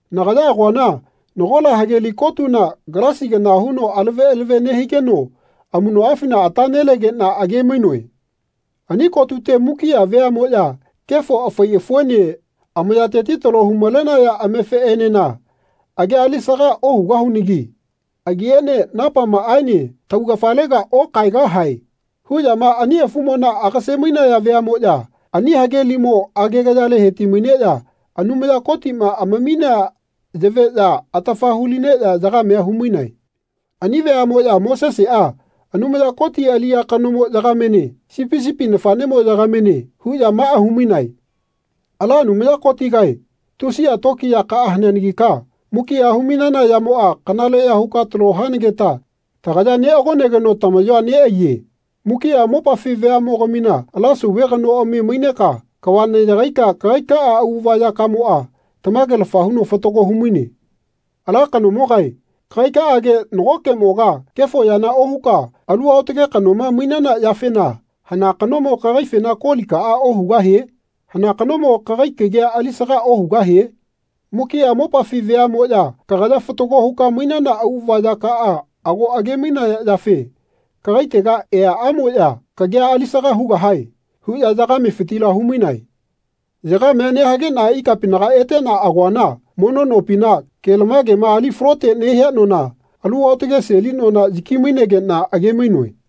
Nagaya agoana nagola hageli kotuna galasi kana huno alave alave nehigeno amuꞌnoꞌafina ata nelegeꞌna age-mainoe. Ani kotute mukiꞌa veaꞌmoꞌya “Kefo afai afuene amayateti talo hu-malenaya amefeꞌenena agia alisaga ohugahunagi. Agiene napamaꞌaene taugafalega okaegahae.” huꞌyama ani afumona agase-mainaya veaꞌmoꞌya ani hagelimo agegayale heti-maineꞌya Anumaya Kotiꞌma amaminea yaveꞌya atafa hu-lineꞌya yagamea humainae. Ani veaꞌmoꞌya Moseseꞌa Anumaya Koti aliꞌya kanomo yagamene Sipi sipi nafaꞌnemo yagamene huꞌya maꞌa humainae “Ala Anumaya Kotigae tusiꞌa tokiyakaꞌa haneanagika mukiꞌa humainana yamoꞌa kanaleꞌya huka talo hanageta tagaya neꞌagonageno tamaꞌyoa neꞌaiye. Mukiꞌa mopafi veaꞌmogamina ala sauve kanoꞌami maineka kava neꞌyagaika kagaikaꞌa auꞌava yakamoꞌa tamagelafa huno fatago humaine. Ala kanomogae kagaikaꞌage nagokeꞌmoga kefo yana ohuka alu aotage kanoma mainana yafena hana kanomo kagaifena kolikaꞌa ohugahie? Hana kanomo kagai kagia alisaga ohugahie? Mukiꞌa mopafi veaꞌmoꞌya kagaya fatago huka mainana auꞌava yakaꞌa ago age-mainaya yafe kagaitega eaꞌamoꞌya kagia alisaga hugahae.” huꞌya yagamefitila humainae. Yagamea nehageꞌna ikapinaga eteꞌna agoana mono nopina, kelamagema ali falote nehia nona, alu aotage seli nona yaki-mainegeꞌna age-mainoe.